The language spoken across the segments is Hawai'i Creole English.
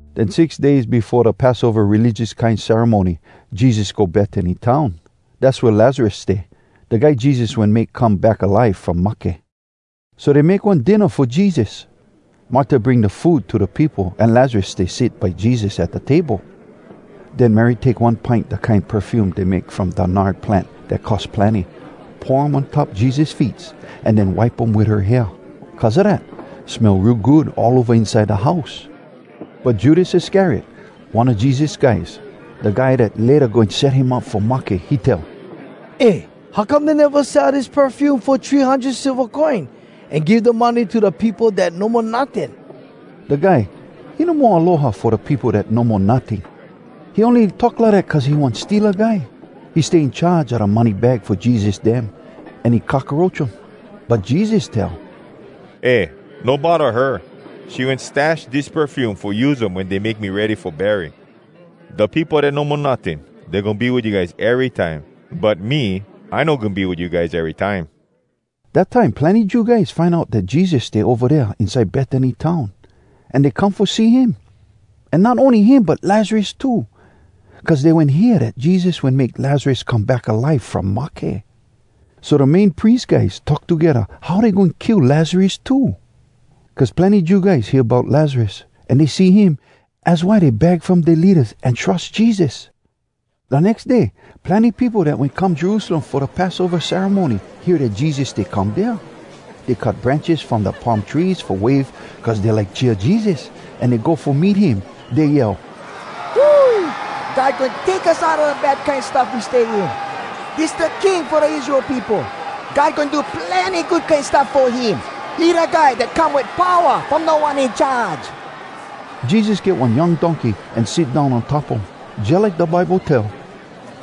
Den six days befo da Passova religious kine ceremony, Jesus go Betany town. Dass wea Lazarus stay, da guy Jesus wen make come back alive from mahke. So dey make one dinna fo Jesus. Marta bring da food to da peopo, an Lazarus stay sit by Jesus at da table. Den Mary take one pint da kine perfume dey make from da nard plant dat cost plenny, pour um on top Jesus feets, an den wipe um wit her hair. Cuz a dat, smell real good all ova inside da house. But Judas Iscariot, one a Jesus guys, da guy dat layta goin set him up fo mahke, he tell, “Eh, how come dey neva sell dis perfume fo three hundred silva coin, an give da money to da peopo dat no mo notting?” Da guy, he no mo aloha fo da peopo dat no mo notting, he ony talk lidat cuz he one steala guy. He stay in charge a da money bag fo Jesus dem, an he cockaroach um. But Jesus tell, “Eh, no bodda her! She wen stash dis perfume fo use um wen dey make me ready fo bury.” Da peopo dat no mo notting, dey goin be wit you guys erytime. But me, I no goin be wit you guys erytime. Dat time plenny Jew guys find out dat Jesus stay ova dea inside Betany town, an dey come fo see him. An not ony him, but Lazarus too. Cuz dey wen hear dat Jesus wen make Lazarus come back alive from mahke. So da Main Pries guys talk togedda how dey goin kill Lazarus too. Cuz plenny Jew guys hear bout Lazarus, an dey see him. Az why dey bag from dea leadas, an trus Jesus. Da nex day, plenny peopo dat wen come Jerusalem fo da Passova ceremony hear dat Jesus stay come dea. Dey cut branches from da palm trees fo wave cuz dey like cheer Jesus, an dey go fo meet him. Dey yell, “Hui! God goin take us Outa da bad kine stuff we stay in! Dis da King fo da Israel peopo! God goin do plenny good kine stuff Fo him. He da guy dat come wit powa From Da One In Charge!” Jesus get one young donkey an sit down on top um, jalike da Bible tell,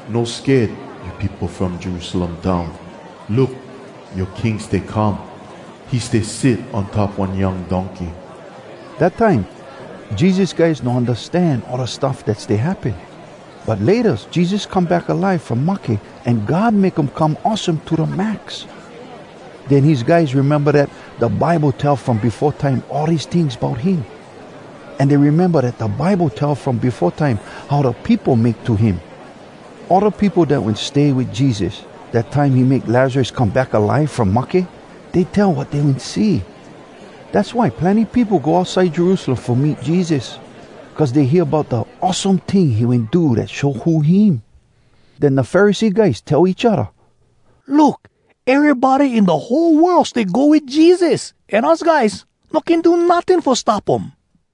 “No sked, you peopo from Jerusalem town! Look! Yoa King stay come! He stay sit on top one young donkey.” Dat time, Jesus guys no undastan all da stuff dat stay happen. But laytas, Jesus come back alive from mahke an God make um come awesome to da max. Den, his guys rememba dat da Bible tell from befo time all dis tings bout him. An dey rememba dat da Bible tell from befo time how da peopo make to him. All da peopo dat wen stay wit Jesus, da time he make Lazarus come back alive from mahke, dey tell wat dey wen see. Dass why plenny peopo go outside Jerusalem fo meet Jesus, cuz dey hear bout da awesome ting he wen do dat show who him. Den da Pharisee guys tell each odda, “Look! Erybody in da whole world stay go wit Jesus! An us guys no can do notting fo stop um!”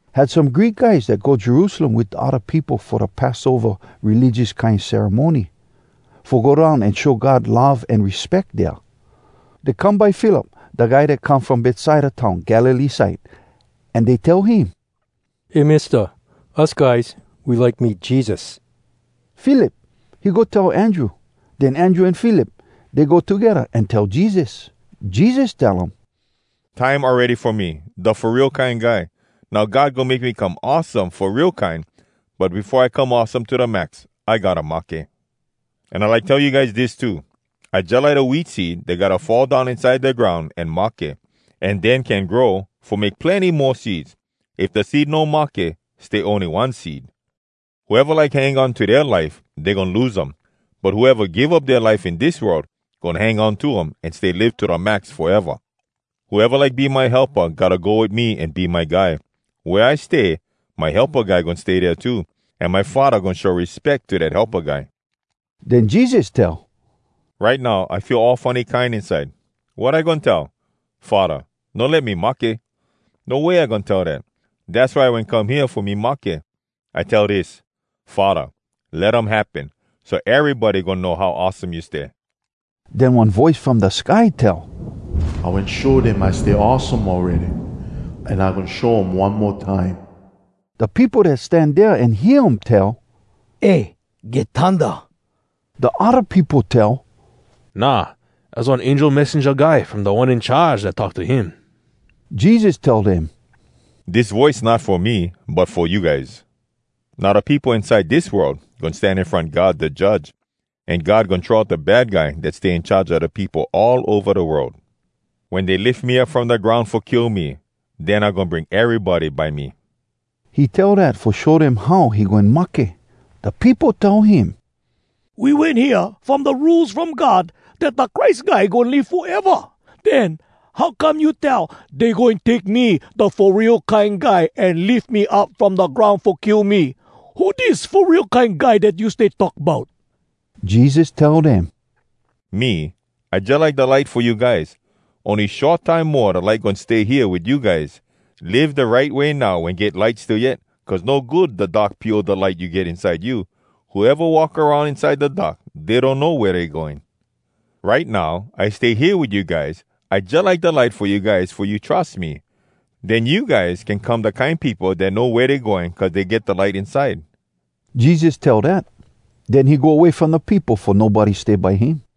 Had some Greek guys dat go Jerusalem wit da odda peopo fo da Passova religious kine ceremony, fo go down an show God love an respeck dea. Dey come by Philip, da guy dat come from Betsaida town Galilee side, an dey tell him, “Eh Mista, us guys, we like meet Jesus.” Philip, he go tell Andrew. Den Andrew an Philip, dey go togedda an tell Jesus. Jesus tell um, “Time awready fo me, da Fo Real Kine Guy. Now God goin make me come awesome fo real kine! But befo I come awesome to da max, I gotta mahke. An I like tell you guys dis too: I jalike da wheat seed dat gotta fall down inside da groun an mahke, an den can grow, fo make plenny mo seeds. If da seed no mahke, stay ony one seed. Whoeva like hang on to dea life, dey goin lose um. But whoeva give up dea life in dis world, goin hang on to um, an stay live to da max foeva. Whoeva like be my helpa gotta go wit me an be my guy. Wea I stay, my helpa guy goin stay dea too. An my Faddah goin show respeck to dat helpa guy.” Den Jesus tell, “Right now I feel all funny kine inside. Wat I goin tell? ‘Faddah, no let me mahke!’? No way I goin tell dat! Dass why I wen come hea, fo me mahke. I tell dis: ‘Faddah, let um happen, so erybody goin know how awesome you stay.’” Den one voice from da sky tell, “I wen show dem I stay awesome awready, an I goin show um one mo time.” Da peopo dat stan dea an hear um tell, “Eh! Get thunda!” Da odda peopo tell, “Nah, az was one angel messenja guy from Da One In Charge dat talk to him.” Jesus tell dem, “Dis voice not fo me, but fo you guys. Now da peopo inside dis world goin stan in front God da Judge, an God goin throw out da Bad Guy dat stay in charge a da peopo all ova da world. Wen dey lif me up from da groun fo kill me, den I goin bring erybody by me.” He tell dat fo show dem how he goin mahke. Da peopo tell him, “We wen hear from da Rules From God dat da Christ Guy goin live foeva. Den how come you tell, ‘Dey goin take me, da Fo Real Kine Guy, an lif me up from da groun fo kill me’? Who dis Fo Real Kine Guy dat you stay talk bout?” Jesus tell dem, “Me, I jalike da light fo you guys. Ony short time mo da light goin stay hea wit you guys. Live da right way now wen get light still yet, cuz no good da dark pio da light you get inside you. Whoeva walk aroun inside da dark, dey donno wea dey going. Right now, I stay hea wit you guys. I jalike da light fo you guys, fo you trus me. Den you guys can come da kine peopo dat know wea dey going cuz dey get da light inside.” Jesus tell dat. Den he go way from da peopo fo nobody stay by him.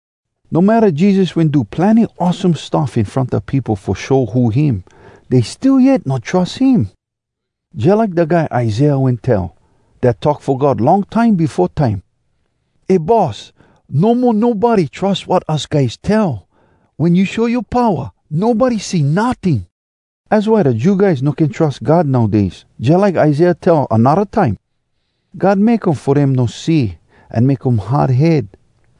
No matta Jesus wen do plenny awesome stuff in front da peopo fo show who him, dey still yet no trus him. Jalike da guy Isaiah wen tell, dat talk fo God long time befo time, “Eh Boss! No mo nobody trus wat us guys tell! Wen you show yoa powa, nobody see notting!” Az why da Jew guys no can trus God nowdays, jalike Isaiah tell anodda time, “God make um fo dem no see, An make um hard head,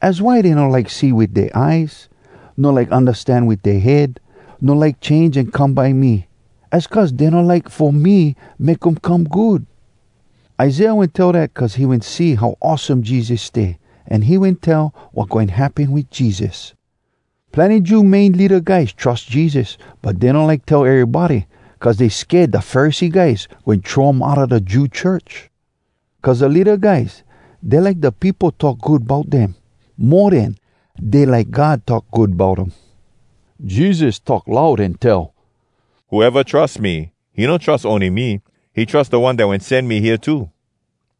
Az why dey no like see wit dea eyes, No like undastan wit dea head, No like change an come by me. Az cuz dey no like fo me Make um come good.” Isaiah wen tell dat cuz he wen see how awesome Jesus stay, an he wen tell wat goin happen wit Jesus. Plenny Jew main leada guys trus Jesus, but dey no like tell erybody, cuz dey sked da Pharisee guys goin throw um outa da Jew church. Cuz da leada guys, dey like da peopo talk good bout dem, mo den dey like God talk good bout um. Jesus talk loud an tell, “Whoeva trus me, he no trus ony me, he trus da One dat wen sen me hea too.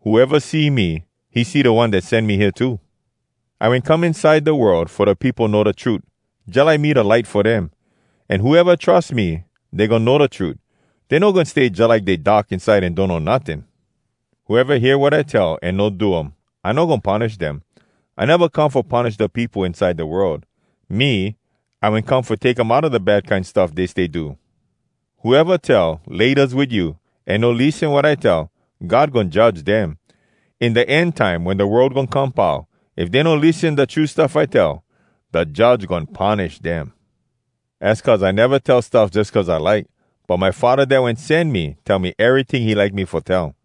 Whoeva see me, he see da One dat sen me hea too. I wen come inside da world fo da peopo know da trut, jalike me da light fo dem. An whoeva trus me, dey goin know da trut. Dey no goin stay jalike dey dark inside an donno notting. Whoeva hear wat I tell an no do um, I no goin punish dem. I neva come fo punish da peopo inside da world. Me, I wen come fo take um outa da bad kine stuff dey stay do. Whoeva tell, ‘Laytas wit you!’ an no lissen wat I tell, God goin judge dem. In da end time wen da world goin come pau, if dey no lissen da true stuff I tell, da judge goin punish dem. Az cuz I neva tell stuff jus cuz I like, but my Faddah dat wen sen me tell me eryting he like me fo tell.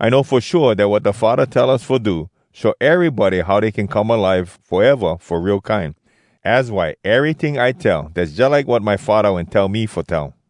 I know fo shua dat wat da Faddah tell us fo do show erybody how dey can come alive foeva fo real kine. Az why eryting I tell, dass jalike wat my Faddah wen tell me fo tell.”